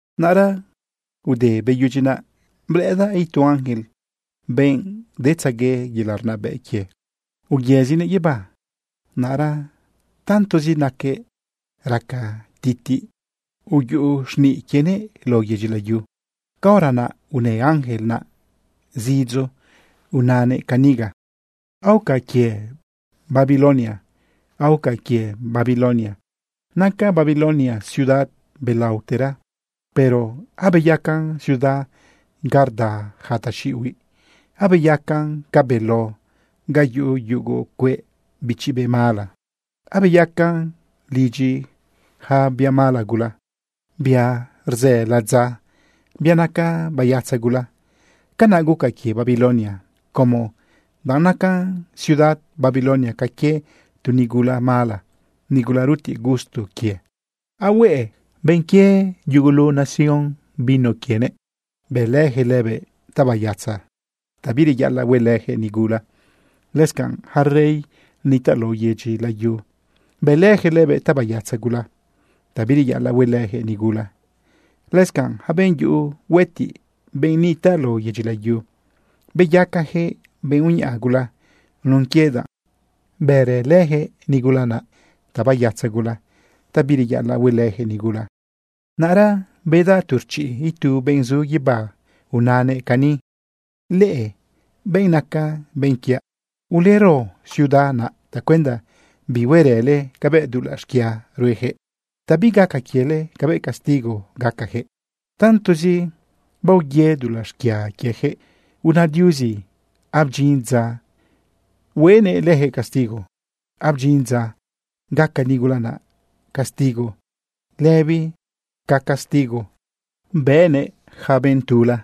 Naꞌra ude beyudyi naꞌ, blëꞌëdaꞌ itu ángel, benꞌ detzague yelaꞌ rnabëꞌ quie, uyëzinëꞌ guibá. Naꞌra tantozi naquëꞌ raca titiꞌ, uyuꞌu xniꞌ quienëꞌ lao yedyi layu. Caora naꞌ unë ángel naꞌ zidzo unanëꞌ caniga: ―Aoca quie Babilonia, aoca quie Babilonia. Naca Babilonia ciudad belaotera, pero abeyacan ciudad ga rda ja taxiꞌihuiꞌ. Abeyacan ca beló ga yuꞌu yugu cueꞌ bichi be mala. Abeyacan lidyi ja bia mala gula, bia rzë ladza, bia naca bayatza gula. Canaꞌ guca quie Babilonia, como danꞌ naca ciudad Babilonia ca quie tu nigula mala, nigula rutiꞌ gusto quie. Ahueꞌe benꞌ quie yugulu nación vino quienëꞌ. Bëlëjëꞌ lëbëꞌ tabayatza, ta bireyaꞌalaꞌ huelëjëꞌ nigula. Lëscanꞌ ja rey nitaꞌ lao yedyi layu, bëlëjëꞌ lëbëꞌ tabayatza gula, ta bireyaꞌalaꞌ huelëjëꞌ nigula. Lëscanꞌ ja benꞌ yuꞌu huëtiꞌ, benꞌ nitaꞌ lao yedyi layu, beyacajëꞌ benꞌ uñaꞌa gula nun quie danꞌ bërëlëjëꞌ nigula naꞌ tabayatza gula, ta bireyaꞌalaꞌ huelëjëꞌ nigula. Naꞌra bedaꞌ tu rchiꞌ itu benꞌ zu guibá. Unanëꞌ cani: ―Leꞌe benꞌ naca benꞌ quiaꞌ. Ulero ciudad naꞌ tacuenda bihuerële cabëꞌ dulaꞌ xquia ruejëꞌ, ta bigaca quiele cabëꞌ castigo gacajëꞌ. Tantozi baoye dulaꞌ xquia quiejëꞌ, una Diuzi abdyin dza huenëꞌ lëjëꞌ castigo. Abdyin dza gaca nigula naꞌ castigo lëbi ca castigo bënëꞌ ja benꞌ tula.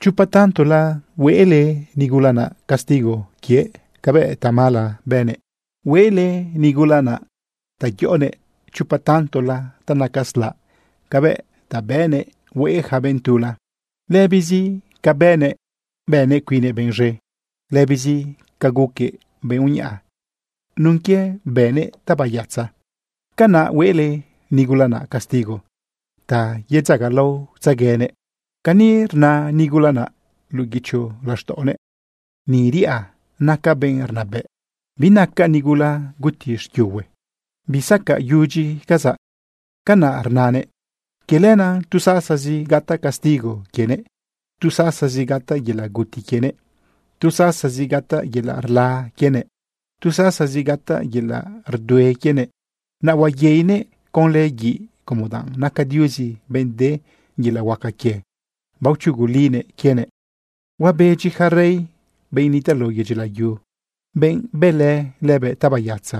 Chopa tantola huele nigula naꞌ castigo quie cabëꞌ tamala bënëꞌ. Hueꞌle nigula naꞌ ta yoꞌonëꞌ chopa tantola ta naca slaꞌ cabëꞌ ta bëꞌnëꞌ hueꞌe ja benꞌ tula. Lëbizi ca bënëꞌ, bënëꞌ cuinnëꞌ benꞌ z̃e, lëbizi ca guquëꞌ benꞌ uñaꞌa nun quie bënëꞌ tabayatza, canaꞌ huele nigula naꞌ castigo ta yedzagalaotzeguenëꞌ. Cani rna nigula naꞌ luꞌu guicho laxtaꞌonëꞌ: “Ni riꞌa. Nacaꞌ benꞌ rnabëꞌ. Binacaꞌ nigula guti xquiuhue. Bisacaꞌyudyicazaꞌ.” Canaꞌ rnanëꞌ. Quie lenaꞌ tu sasazi gataꞌ castigo quienëꞌ. Tu sasazi gataꞌ yelaꞌ guti quienëꞌ. Tu sasazi gataꞌ yelaꞌ rla quienëꞌ. Tu sasazi gataꞌ yelaꞌ rdue quienëꞌ. Naꞌ huayeinëꞌ conlë guiꞌ como danꞌ naca Diuzi benꞌ de yelaꞌ huaca quie baochugulinëꞌ quienëꞌ. Huabedyi ja rey, benꞌ nitaꞌ lao yedyi layu, benꞌ bëlë lëbëꞌ tabayatza.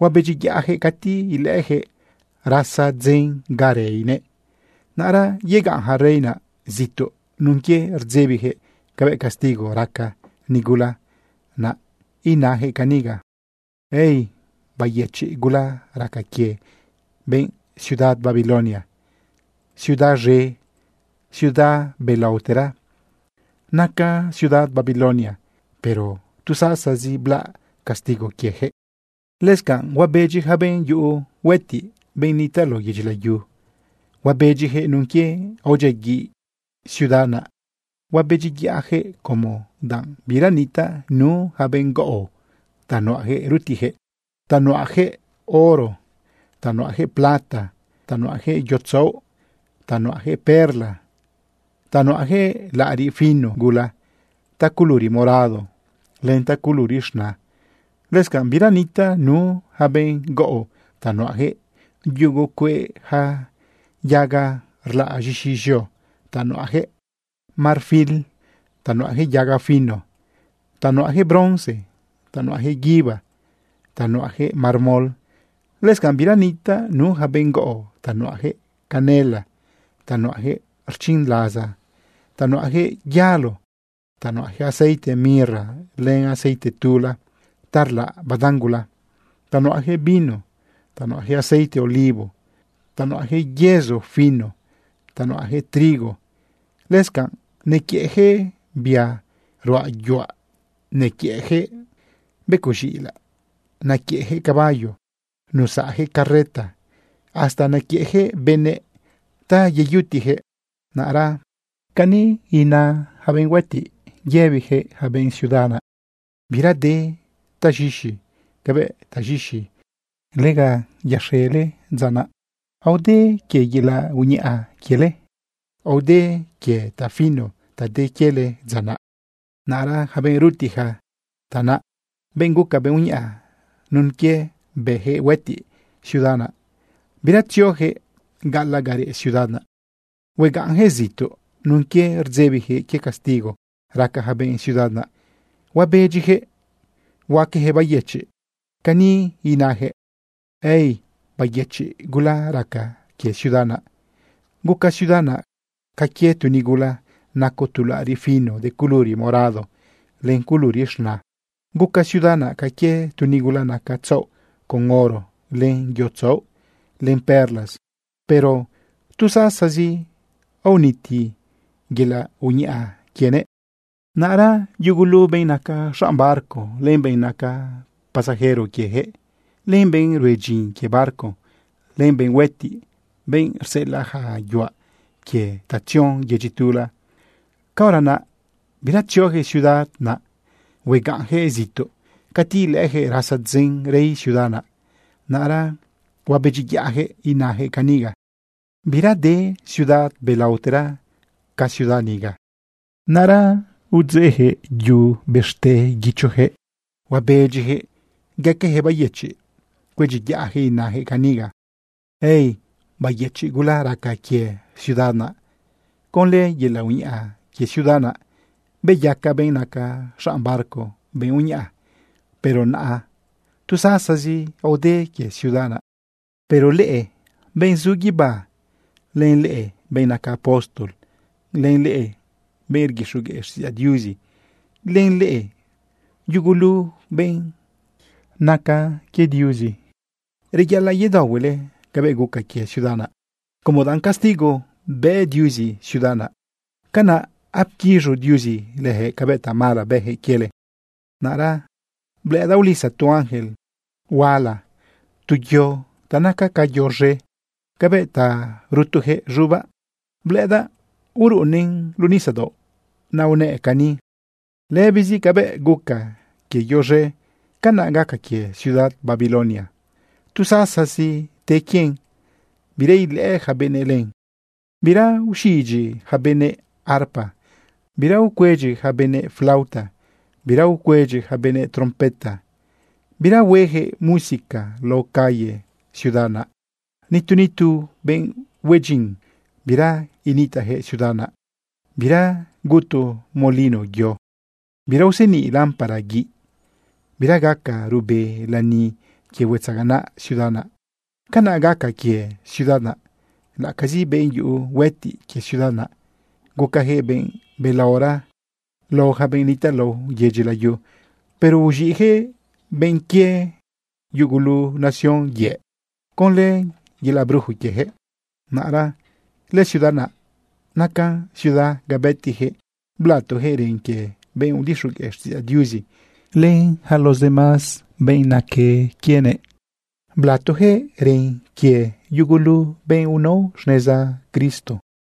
Huabedyiyaꞌjëꞌ cati ilëꞌëjëꞌ rasa dzen ga reinëꞌ. Naꞌra yegaꞌn ja rey naꞌ zituꞌ nun quie rdzebijëꞌ cabëꞌ castigo raca nigula naꞌ inajëꞌ caniga: ―¡Ay! ¡Bayëchiꞌ gula raca quie benꞌ ciudad Babilonia! Ciudad z̃e, ciudad belaotera naca ciudad Babilonia, pero tu sasazi blaꞌ castigo quiejëꞌ. Lëscanꞌ huabedyi ja benꞌ yuꞌu huëtiꞌ, benꞌ nitaꞌ lao yedyi layu. Huabedyijëꞌ nun quie aodyiaguiꞌ lëciudad naꞌ. Huabedyiyaꞌjëꞌ como danꞌ bira nitaꞌ nu ja benꞌ gaꞌo ta nuꞌajëꞌ rutiꞌjëꞌ ta nuꞌajëꞌ oro, ta nuꞌajëꞌ plata, ta nuꞌajëꞌ yo tzaoꞌ, ta nuꞌajëꞌ perla, ta nuꞌajëꞌ laꞌariꞌ fino gula taculuri morado len taculuri z̃na. Lëscanꞌ bira nitaꞌ nu ja benꞌ gaꞌo ta nuꞌajëꞌ yugu cueꞌ ja yaga rlaꞌ z̃ixi z̃eo, ta nuꞌajëꞌ marfil, ta nuꞌajëꞌ yaga fino, ta nuꞌajëꞌ bronce, ta nuꞌajëꞌ guibá, ta nuꞌajëꞌ mármol. Lëscanꞌ bira nitaꞌ nu ja benꞌ gaꞌo ta nuꞌajëꞌ canela, ta nuꞌajëꞌ rchinlaza, ta nuꞌajëꞌ yalo, ta nuꞌajëꞌ aceite mirra len aceite tula ta rlaꞌ badan gula, ta nuꞌajëꞌ vino, ta nuꞌajëꞌ aceite olivo, ta nuꞌajëꞌ yezo fino, ta nuꞌajëꞌ trigo. Lëscanꞌ nequiëꞌjëꞌ bia ruꞌa yuaꞌ, nequiëꞌjëꞌ becoꞌ z̃iꞌilaꞌ, nequiëꞌjëꞌ caballo, nusaꞌjëꞌ carreta, hasta nequiëꞌjëꞌ benëꞌ ta yeyutiꞌjëꞌ. Naꞌra cani ina yaca benꞌ huëtiꞌ rëbijëꞌ yaca benꞌ ciudad naꞌ: ―Bira de taz̃ixi cabëꞌ taz̃ixi lega yaxele dza naꞌ. Aode quie yelaꞌ uñaꞌa quiele, aode quie tafino ta de quiele dza naꞌ. Naꞌra ja benꞌ rutiꞌja tanaꞌ, benꞌ guca benꞌ uñaꞌa nun quie bëjëꞌ huëtiꞌ ciudad naꞌ, bira tziojëꞌ gaꞌalaꞌ ga reꞌ ciudad naꞌ. Huegaꞌnjëꞌ zituꞌ nun quie rdzebijëꞌ quie castigo raca ja benꞌ ciudad naꞌ. Huabedyijëꞌ huaquejëꞌ bayëchiꞌ. Cani inajëꞌ: ―¡Ay! ¡Bayëchiꞌ gula raca quie ciudad naꞌ! Guca ciudad naꞌ ca quie tu nigula naco tu laꞌariꞌ fino de culuri morado len culuri z̃na. Guca ciudad naꞌ ca quie tu nigula naca tzaoꞌ con oro, len yo tzaoꞌ, len perlas. Pero tu sasazi aoniti yelaꞌ uñaꞌa quienëꞌ. Naꞌra yugulu benꞌ naca xanꞌ barco, len benꞌ naca pasajero quiejëꞌ, len benꞌ rue dyin quie barco, len benꞌ huëtiꞌ, benꞌ rseꞌelaꞌ ja yuaꞌ quie ta tzion yedyi tula, caora naꞌ bira tziojëꞌ ciudad naꞌ huegaꞌnjëꞌ zituꞌ. Cati ilëꞌëjëꞌ rasa dzen rei ciudad naꞌ, naꞌra huabedyiyaꞌjëꞌ inajëꞌ caniga: ―¡Bira de ciudad belaotera ca ciudad niga! Naꞌra udzeꞌjëꞌ yu guichojëꞌ, huabedyijëꞌ gaquejëꞌ bayëchiꞌ, cuedyiyaꞌjëꞌ, inajëꞌ caniga: ―¡Ay! Bayëchiꞌ gula raca quie ciudad naꞌ. Conlë yelaꞌ uñaꞌa quie ciudad naꞌ beyaca benꞌ naca xanꞌ barco benꞌ uñaꞌa. Pero naꞌa tu sasazi aode quie ciudad naꞌ. Pero leꞌe benꞌ zu guibá, len leꞌe benꞌ naca apóstol, len leꞌe benꞌ rguixogueꞌ xtiꞌidzaꞌ Diuzi, len leꞌe yugulu benꞌ naque quie Diuzi, reyaꞌalaꞌ yedaohuele cabëꞌ guca quie ciudad naꞌ, como danꞌ castigo bë Diuzi ciudad naꞌ. Canaꞌ apquiz̃u Diuzi lëjëꞌ cabëꞌ tamala bëjëꞌ quiele. Naꞌra blëꞌëdaꞌ ulisa tu ángel huaꞌalaꞌ tu yo ta naca ca yo z̃e cabëꞌ ta rutujëꞌ z̃ubaꞌ. Blëꞌëdaꞌ uruꞌunnëꞌn luꞌu nisadaoꞌ. Naꞌ unëꞌ cani: ―Lëbizi cabëꞌ guca quie yo z̃e, canaꞌ gaca quie ciudad Babilonia. Tu sasazi te quien, bira ilëꞌë yaca benëꞌ len. Bira uxidyi ja benëꞌ arpa, bira ucuedyi ja benëꞌ flauta, bira ucuedyi ja benëꞌ trompeta, bira huejëꞌ música lao calle ciudad naꞌ. Nitu nitu benꞌ hue dyin, bira initaꞌjëꞌ ciudad naꞌ. Bira gutu molino yo, bira useniꞌ lámpara guiꞌ, bira gaca ruꞌbe lani quie huetzaganaꞌ ciudad naꞌ. Canaꞌ gaca quie ciudad naꞌ laꞌacazi benꞌ yuꞌu huetiꞌ quie ciudad naꞌ, gucajëꞌ benꞌ belaora lao yaca benꞌ nitaꞌ lao yedyi layu, pero uz̃iꞌjëꞌ benꞌ quie yugulu nación yëꞌ conlë yelaꞌ brujo quiejëꞌ. Naꞌra lëciudad naꞌ nacan ciudad ga bëtijëꞌ blatojëꞌ ren quie benꞌ udixogueꞌ xtiꞌidzaꞌ Diuzi len yaca los demás benꞌ naque quienëꞌ. Blatojëꞌ ren quie yugulu benꞌ unao xneza Cristo.